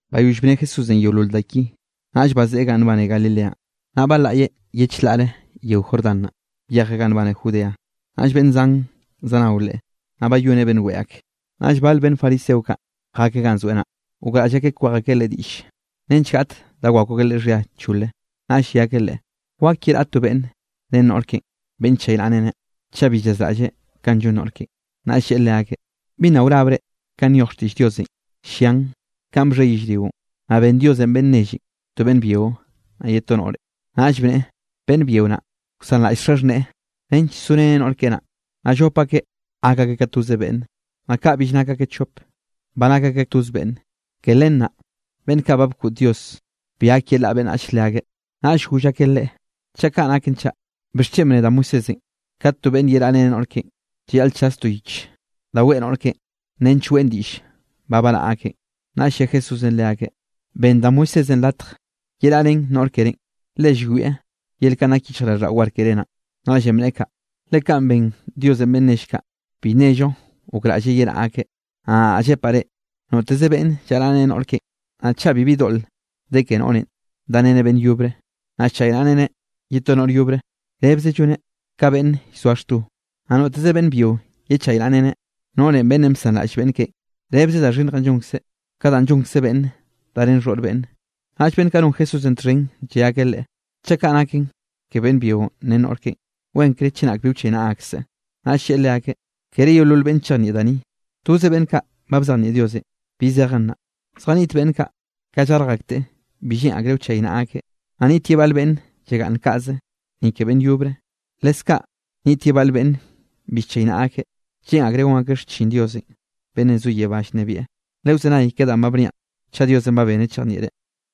Bayoll bne Jesúsenꞌ yeolol da ki, naꞌll bazeꞌe ganꞌ nbane Galileanꞌ, naꞌ balaꞌyeꞌ ye chlaꞌre yeo Jordán naꞌ, byejeꞌ ganꞌ nbane Judea. Naꞌll beꞌnn zan zanao Leꞌe, naꞌ bayoneꞌ beꞌnn weꞌe ak. Naꞌll bale beꞌnn fariseo kaꞌ jakeꞌ ganꞌ zoeꞌ naꞌ, gokraꞌll akeꞌ kwej akeꞌ Leꞌe diꞌll nench naꞌ gaꞌt da wakw akeꞌ Leꞌe xhia chole, naꞌll lle akeꞌ Leꞌe: —¿Wak yeraꞌa to beꞌnn ren noꞌr keꞌen, beꞌnn nchaynaꞌreneꞌ, chaꞌ bi llazraꞌlleꞌ kanꞌ llon noꞌr keꞌen? Naꞌll lleꞌe leakeꞌ: —¿Bi nna wrabre kanꞌ nyoj xtiꞌll Diosenꞌ? Llian kanꞌ bxhe yellrionꞌ, naꞌ ben Diosenꞌ beꞌnn nelle to beꞌnn byio naꞌ ye to noꞌre. Naꞌll bneꞌe: “Beꞌnn byio naꞌ, wsanraꞌll xaxhneꞌe nench soreneꞌ noꞌr keꞌe naꞌ, naꞌ llop akeꞌ gak akeꞌ ka toze beꞌnne.” Naꞌ kaꞌ bill nak akeꞌ chopeꞌ, ba nak akeꞌ toz beꞌnne. Ke len naꞌ beꞌnn ba bkoꞌd Dios bi gak yelaꞌa beꞌnnach leakeꞌ. Naꞌll goll akeꞌ Leꞌe: —Chaꞌ kaꞌ naken chaꞌ, ¿bixchen bne da Moisésenꞌ, kat to beꞌnne yeraꞌrén noꞌr keꞌen, llayaꞌl chas to yich da weꞌe noꞌr keꞌen nench weꞌn diꞌll ba baraꞌa akeꞌn? Naꞌll lle Jesúsenꞌ leakeꞌ: —Benn da Moisésenꞌ latj yeraꞌrén noꞌr kerénꞌ, le llwieꞌ yel kanꞌ nak yichjraꞌlldaꞌo war keré naꞌn, naꞌllenꞌ bneꞌe kaꞌ. Le kanꞌ ben Diosenꞌ beꞌnn nell kaꞌ, bi nnello gokraꞌlleꞌ yeraꞌa akeꞌ. Naꞌ nadaꞌ llepaꞌ reꞌ, noteze beꞌnn llaraꞌreneꞌ noꞌr keꞌen, naꞌ chaꞌ bibi doꞌl de ke noꞌrenꞌ dareneꞌ beꞌnn yobre, naꞌ llchaynaꞌreneꞌ ye to noꞌr yobre, rebze lloneꞌ ka beꞌnn llzoa xto. Naꞌ noteze beꞌnn byio yechaynaꞌreneꞌ noꞌre beꞌnn bsanraꞌll beꞌnn keꞌen, rebze da xhinnjenꞌ llonkzeꞌ ka danꞌ llonkze beꞌnnenꞌ darén xhoꞌr beꞌnne. Naꞌll beꞌnn kaꞌ non Jesúsenꞌ txhen lle akeꞌ Leꞌe: —Chaꞌ kaꞌ naken ke beꞌnn byio ren noꞌr keꞌen, wenkre chenak bi wchaynaꞌa akseꞌ. Naꞌll lleꞌe leakeꞌ: —Kere yeolol beꞌnne chejnieꞌ da ni, toze beꞌnn kaꞌ ba bzejnieꞌ Diosenꞌ bi zejen naꞌ. Zjaniꞌt beꞌnn kaꞌ, ka llarj akteꞌ bi lleꞌn akreꞌ wchaynaꞌa akeꞌ. Naꞌ niꞌt ye bal beꞌnn llagaꞌnn kaꞌze, ni ke beꞌnn yobre. Leskaꞌ niꞌt ye bal beꞌnn bi llchaynaꞌa akeꞌ, lleꞌn akreꞌ gon akeꞌ xchin Diosenꞌ beꞌnnenꞌ zo yebá llnebieꞌ. Lewzenay ka danꞌ ba bniaꞌn chaꞌ Diosenꞌ ba beneꞌ chejnieꞌre.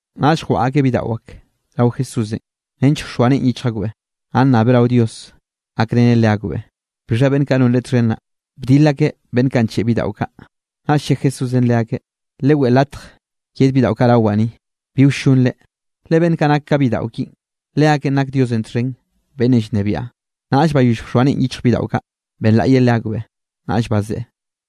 Naꞌll jwaꞌa akeꞌ bidaꞌo ak rao Jesúsenꞌ nench wxoa neꞌen yichj akbeꞌ, naꞌ nnabeꞌ rao Dios gakreneꞌ leakbeꞌ. Bixha beꞌnn kaꞌ non Leꞌe txhen naꞌ, bdil akeꞌ beꞌnn kaꞌ ncheꞌe bidaꞌo kaꞌ. Naꞌll lle Jesúsenꞌ leakeꞌ: —Leweꞌe latj yed bidaꞌo kaꞌ rawaꞌ ni, bi wllonre, le beꞌnn kaꞌ nak ka bidaꞌo kinꞌ, leakeꞌn nak Diosenꞌ txhen beꞌnnenꞌ llnebiaꞌ. Naꞌll bayoll bxoa neꞌen yichj bidaꞌo kaꞌ, benlaꞌye leakbeꞌ, naꞌll bazeꞌe.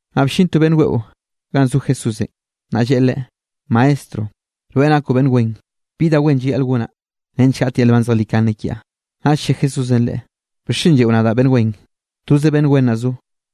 Naꞌ bllin to beꞌnn weꞌo ganꞌ zo Jesúsenꞌ, naꞌ lleꞌe Leꞌe: —Maestro, rweꞌ nakoꞌ beꞌnn wen, ¿Bi da wen llayaꞌl gonaꞌ nench gaꞌt yel nban zejlikane kiaꞌ? Naꞌll lle Jesúsenꞌ leꞌe: —¿Bixchen lleꞌo nadaꞌ beꞌnn wen? Toze beꞌnn wen naꞌ zo,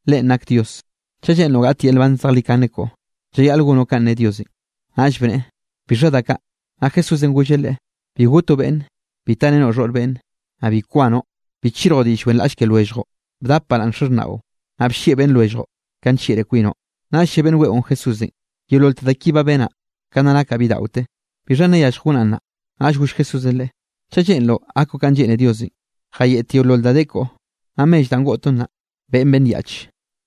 Leꞌen nak Dios. Chaꞌ lleꞌnroꞌ gaꞌt yel nban zejlikane koꞌo, llayaꞌl gonoꞌ kanꞌ ne Diosenꞌ. Naꞌll bneꞌe: —¿Bixha da kaꞌ? Naꞌ Jesúsenꞌ golleꞌ leꞌe: —Bi gotoꞌ beꞌnne, bi tarenoꞌ xhoꞌr beꞌnne, naꞌ bi kwanoꞌ, bi chirjoꞌ diꞌll wenraꞌll ke lwelljoꞌ. Bdap baraꞌnn xaxhnaꞌo, naꞌ bllieꞌ beꞌnn lwelljoꞌ kanꞌ nllieꞌre kwinoꞌ. Naꞌll lle beꞌnn weꞌon Jesúsenꞌ: —Yeololte da ki ba benaꞌ, ka nna nakaꞌ bidaꞌote. ¿Bixha nna yallj gonaꞌ nnaꞌ? Naꞌll goll Jesúsenꞌ leꞌe: —Chaꞌ lleꞌnroꞌ gakoꞌ kanꞌ lleꞌne Diosenꞌ, jayeꞌt yeolol da de koꞌo, naꞌ mell danꞌ goꞌtoꞌn naꞌ, beꞌen beꞌnn yaꞌch,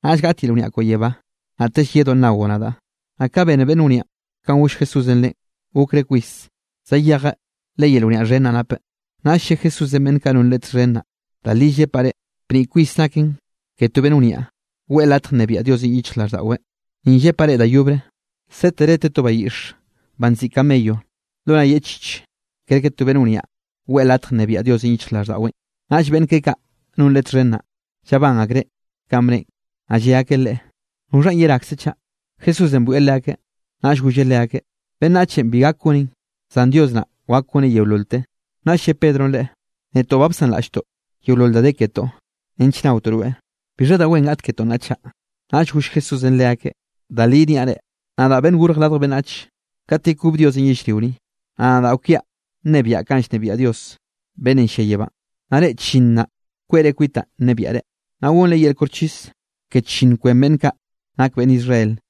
naꞌll gaꞌt yel wniaꞌ koꞌo yebá, naꞌtell yedoꞌ nnaoꞌ nadaꞌ. Naꞌ ka bene beꞌnn wniaꞌn kanꞌ goll Jesúsenꞌ leꞌen, gokreꞌ kwis, zayejeꞌ le yel wniaꞌ xhen naꞌ napeꞌ. Naꞌll lle Jesúsenꞌ beꞌnn kaꞌ non Leꞌe txhen naꞌ: —Da li llepaꞌ reꞌ, bniꞌ kwis naken ke to beꞌnn wniaꞌ, weꞌe latj nnebiaꞌ Diosenꞌ yichjraꞌlldaꞌweꞌ. Ni yepaꞌ reꞌ da yobre, sétere te to bayiꞌxe banꞌ nziꞌi camello lo nay yeꞌchich, kerke to beꞌnn wniaꞌ weꞌe latj nnebiaꞌ Diosenꞌ yichjraꞌlldaꞌweꞌn. Naꞌll beꞌnn keꞌe kaꞌ non Leꞌe txhen naꞌ, llabán akreꞌ kanꞌ bneꞌen, naꞌ lle akeꞌ Leꞌe: —¿Noxha yerakzenꞌ chaꞌ? Jesúsenꞌ bwieꞌ leakeꞌ, naꞌll golleꞌ leakeꞌ: —Beꞌnnachenꞌ bi gak goneꞌn, zan Dios naꞌ wak goneꞌ yeololte. Naꞌll lle Pedronꞌ Leꞌe: —Netoꞌ ba bsanraꞌlltoꞌ yeolol da de ketoꞌ nench naotoꞌ rweꞌ. ¿Bixha da wen gaꞌt ketoꞌ nnaꞌ chaꞌ? Naꞌll goll Jesúsenꞌ leakeꞌ: —Da li niaꞌ reꞌ, nadaꞌ Beꞌnnenꞌ Gorj Radj Beꞌnnach, kat yekob Diosenꞌ yellrio ni, naꞌ nadaꞌ kwiaꞌ nnebiaꞌ kanꞌ llnebiaꞌ Dios beꞌnnenꞌ llia yebánꞌ. Naꞌ reꞌ chllinn naꞌ, kweꞌre kwitaꞌn nnebiaꞌre, naꞌ gonre yel koxchis ke chllinn kwen beꞌnn kaꞌ nak beꞌnn Israel.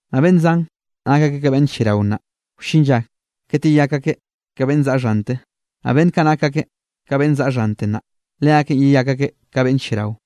Naꞌ beꞌnn zan, nak akeꞌ ka beꞌnn lliarao nnaꞌ, wllin lla kat yeyak akeꞌ ka beꞌnn zaꞌa xhante, naꞌ beꞌnn kaꞌ nak akeꞌ ka beꞌnn zaꞌa xhante nnaꞌ, leakeꞌn yeyak akeꞌ ka beꞌnn lliarao.